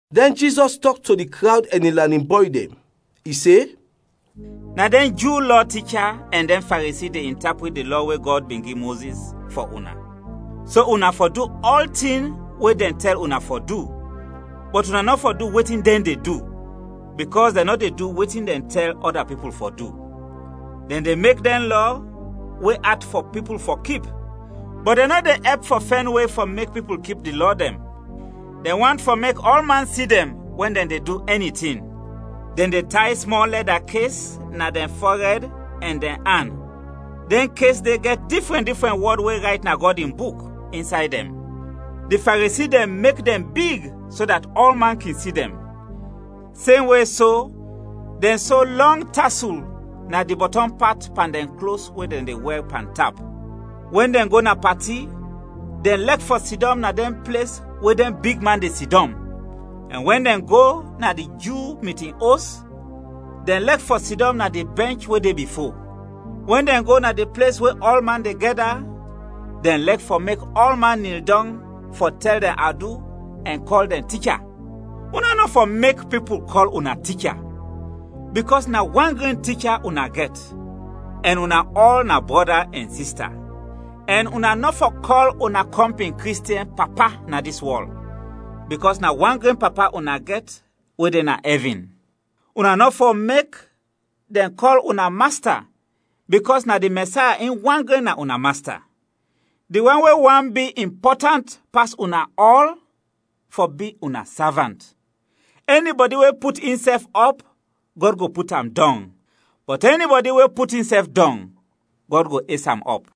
Dɛn Jizɔs tɔk to di krawd ɛn in lanin bɔy dɛn. I se, “Na dɛn Ju Lɔ ticha ɛn dɛn Faresi de intaprit di Lɔ we Gɔd bin gi Mozis, fɔ una. So una fɔ du ɔltin we dɛn tɛl una fɔ du, bɔt una nɔ fɔ du wetin dɛn de du, bikɔs dɛn nɔ de du wetin dɛn de tɛl ɔda pipul fɔ du. Dɛn de mek dɛn lɔ we at fɔ pipul fɔ kip, bɔt dɛn nɔ de ɛp fɔ fɛn we fɔ mek pipul kip di lɔ dɛn. Dɛn want fɔ mek ɔlman si dɛn wɛn dɛn de du ɛni tin. Dɛn de tay smɔl lɛda kes na dɛn fɔrɛd ɛn dɛn an; dɛn kes de gɛt difrɛn difrɛn wɔd we rayt na Gɔd in Buk, insay dɛn; di Faresi dɛn mek dɛn big so dat ɔlman kin si dɛn. Semwe so, dɛn so lɔng tasul na di bɔtɔm pat pan dɛn klos we dɛn de wɛr pantap. Wɛn dɛn go na pati, dɛn lɛk fɔ sidɔm na dɛn ples we dɛn bigman de sidɔm, ɛn wɛn dɛn go na di Ju mitin os, dɛn lɛk fɔ sidɔm na di bɛnch we de bifo. Wɛn dɛn go na di ples we ɔlman de gɛda, dɛn lɛk fɔ mek ɔlman nil dɔng fɔ tɛl dɛn adu ɛn kɔl dɛn ‘Ticha.’ Una nɔ fɔ mek pipul kɔl una ‘Ticha,’ bikɔs na wan gren Ticha una gɛt, ɛn una ɔl na brɔda ɛn sista. Ɛn una nɔ fɔ kɔl una kɔmpin Kristiɛn ‘Papa’ na dis wɔl, bikɔs na wan gren Papa una gɛt we de na ɛvin. Una nɔ fɔ mek dɛn kɔl una ‘Masta,’ bikɔs na di Mɛsaya in wan gren na una Masta. Di wan we want bi impɔtant pas una ɔl fɔ bi una savant. Ɛnibɔdi we put insɛf ɔp, Gɔd go put am dɔng, bɔt ɛnibɔdi we put insɛf dɔng, Gɔd go es am ɔp.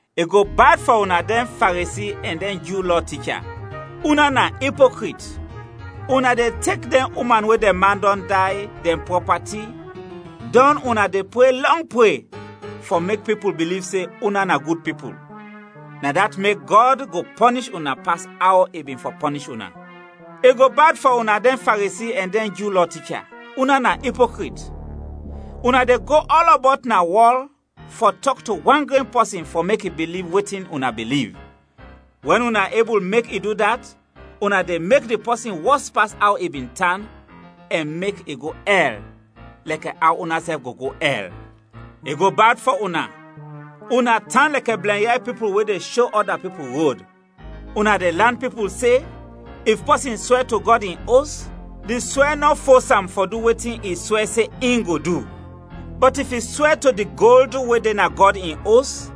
I go bad fɔ una dɛn Faresi ɛn dɛn Ju Lɔ ticha; una na ipokrit! Una de tek dɛn uman we dɛn man dɔn day, dɛn prɔpati; dɔn una de pre lɔng pre fɔ mek pipul biliv se una na gud pipul; na dat mek Gɔd go pɔnish una pas aw i bin fɔ pɔnish una.] “I go bad fɔ una dɛn Faresi ɛn dɛn Ju Lɔ ticha; una na ipokrit! Una de go ɔlɔbɔt na wɔl fɔ tɔk to wan gren pɔsin fɔ mek i biliv wetin una biliv, wɛn una ebul mek i du dat, una de mek di pɔsin wɔs pas aw i bin tan ɛn mek i go ɛl, lɛkɛ aw unasɛf go go ɛl. “I go bad fɔ una; una tan lɛkɛ blɛnyay pipul we de sho ɔda pipul rod! Una de lan pipul se, ‘If pɔsin swɛ to Gɔd in Os, di swɛ nɔ fos am fɔ du wetin i swɛ se in go du; bɔt if i swɛ to di gold we de na Gɔd in Os,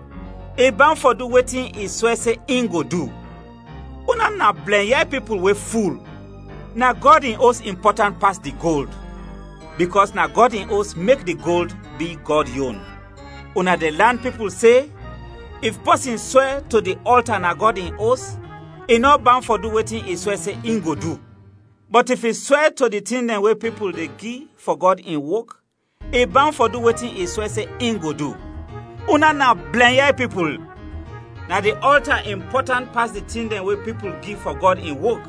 i bawn fɔ du wetin i swɛ se in go du.’ Una na blɛnyay pipul we ful! Na Gɔd in Os impɔtant pas di gold, bikɔs na Gɔd in Os mek di gold bi Gɔd yon. Una de lan pipul se, ‘If pɔsin swɛ to di ɔlta na Gɔd in Os, i nɔ bawn fɔ du wetin i swɛ se in go du; bɔt if i swɛ to di tin dɛn we pipul de gi fɔ Gɔd in wok, i bawn fɔ du wetin i swɛ se in go du.’ Una na blɛnyay pipul! Na di ɔlta impɔtant pas di tin dɛn we pipul gi fɔ Gɔd in wok,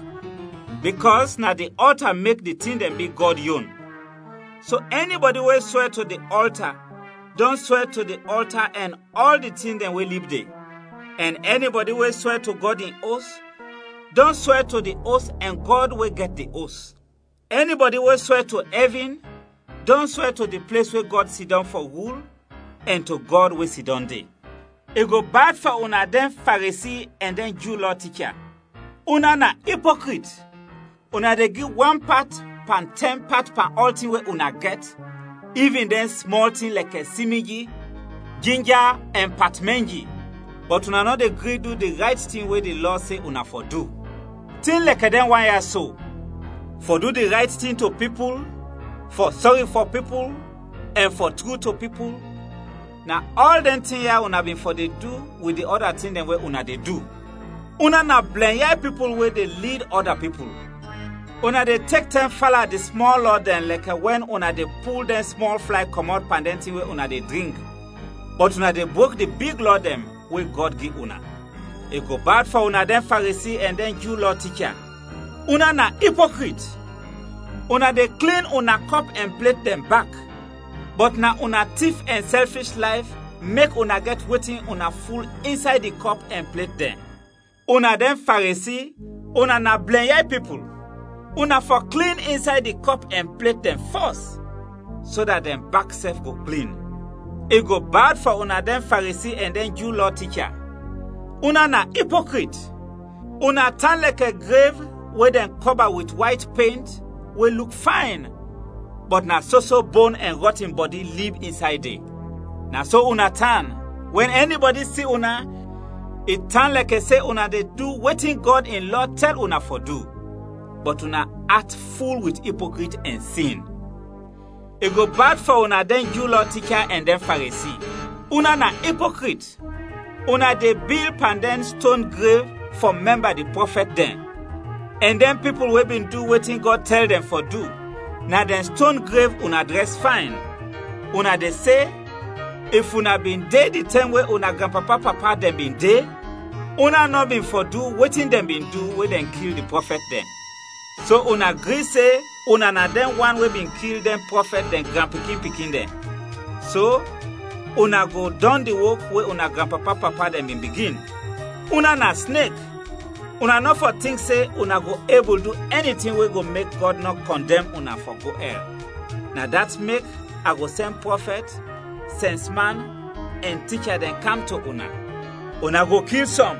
bikɔs na di ɔlta mek di tin dɛn bi Gɔd yon. So ɛnibɔdi we swɛ to di ɔlta, dɔn swɛ to di ɔlta ɛn ɔl di tin dɛn we lib de. Ɛn ɛnibɔdi we swɛ to Gɔd in Os, dɔn swɛ to di Os ɛn Gɔd we gɛt di Os. Ɛnibɔdi we swɛ to ɛvin, dɔn swɛ to di ples we Gɔd sidɔm fɔ rul ɛn to Gɔd we sidɔm de. “I go bad fɔ una dɛn Faresi ɛn dɛn Ju Lɔ ticha; una na ipokrit! Una de gi wan pat pan tɛn pat pan ɔltin we una gɛt, ivin dɛn smɔl tin lɛkɛ simiji, jinja ɛn patmanji; bɔt una nɔ de gri du di rayt tin we di Lɔ se una fɔ du. Tin lɛkɛ dɛn wan ya so: fɔ du di rayt tin to pipul, fɔ sɔri fɔ pipul ɛn fɔ tru to pipul, na ɔl dɛn tin ya una bin fɔ de du wit di ɔda tin dɛn we una de du. Una na blɛnyay pipul we de lid ɔda pipul. Una de tek tɛm fala di smɔl lɔ dɛn lɛkɛ wɛn una de pul dɛn smɔl flay kɔmɔt pan dɛn tin we una de drink, bɔt una de brok di big lɔ dɛn we Gɔd gi una! “I go bad fɔ una dɛn Faresi ɛn dɛn Ju Lɔ ticha; una na ipokrit! Una de klin una kɔp ɛn plet dɛn bak, bɔt na una tif ɛn sɛlfish layf mek una gɛt wetin una ful insay di kɔp ɛn plet dɛn. Una dɛn Faresi, una na blɛnyay pipul! Una fɔ klin insay di kɔp ɛn plet dɛn fɔs, so dat dɛn bak sɛf go klin. “I go bad fɔ una dɛn Faresi ɛn dɛn Ju Lɔ ticha; una na ipokrit! Una tan lɛkɛ grev we dɛn kɔba wit wayt pent, we luk fayn, bɔt na soso bon ɛn rɔtin bɔdi lib insay de. Na so una tan, wɛn ɛnibɔdi si una, i tan lɛkɛ se una de du wetin Gɔd in lɔ tɛl una fɔ du, bɔt una at ful wit ipokrit ɛn sin. “I go bad fɔ una dɛn Ju Lɔ ticha ɛn dɛn Faresi; una na ipokrit! Una de bil pan dɛn ston grev fɔ mɛmba di prɔfɛt dɛn; ɛn dɛn pipul we bin du wetin Gɔd tɛl dɛn fɔ du, na dɛn ston grev una drɛs fayn. Una de se, ‘If una bin de di tɛm we una granpapa-papa dɛn bin de, una nɔ bin fɔ du wetin dɛn bin du we dɛn kil di prɔfɛt dɛn.’ So una gri se una na dɛn wan we bin kil dɛn prɔfɛt, dɛn granpikin-pikin dɛn. So, una go dɔn di wok we una granpapa-papa dɛn bin bigin! Una na snek! Una nɔ fɔ tink se una go ebul du ɛni tin we go mek Gɔd nɔ kɔndɛm una fɔ go ɛl. Na dat mek a go sɛn prɔfɛt, sɛnsman, ɛn ticha dɛn kam to una. Una go kil sɔm,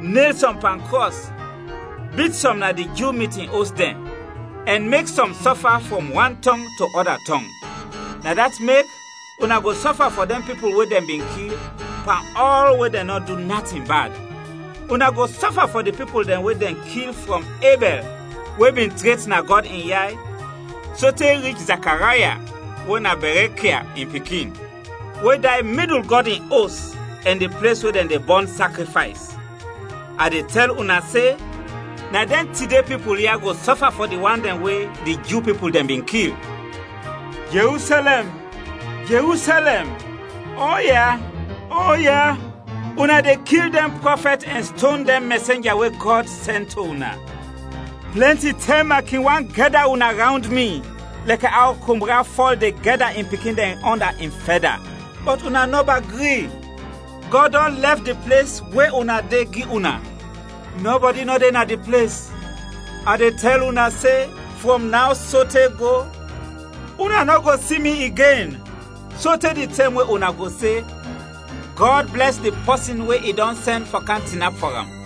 nel sɔm pan krɔs, bit sɔm na di Ju mitin os dɛn, ɛn mek sɔm sɔfa frɔm wan tɔng to ɔda tɔng. Na dat mek, una go sɔfa fɔ dɛn pipul we dɛn bin kil, pan ɔl we dɛn nɔ du natin bad. Una go sɔfa fɔ di pipul dɛn we dɛn kil frɔm Ebɛl we bin tret na Gɔd in yay sote rich Zakaraya we na Bɛrɛkia in pikin, we day midul Gɔd in Os ɛn di ples we dɛn de bɔn sakrifays. A de tɛl una se, na dɛn tide pipul ya go sɔfa fɔ di wan dɛn we di Ju pipul dɛn bin kil! “Jerusɛlɛm, Jerusɛlɛm, oya, oya, una de kil dɛn prɔfɛt ɛn ston dɛn mɛsenja we Gɔd sɛn to una! Plɛnti tɛm a kin want gɛda una rawnd mi, lɛkɛ aw kombra fɔl de gɛda in pikin dɛn ɔnda in fɛda, bɔt una nɔba gri! Gɔd dɔn lɛf di ples we una de, gi una; nɔbɔdi nɔ de na di ples. A de tɛl una se, frɔm naw sote go, una nɔ go si mi igen, sote di tɛm we una go se, ‘Gɔd blɛs di pɔsin we i dɔn sɛn fɔ kam tinap fɔ am.’”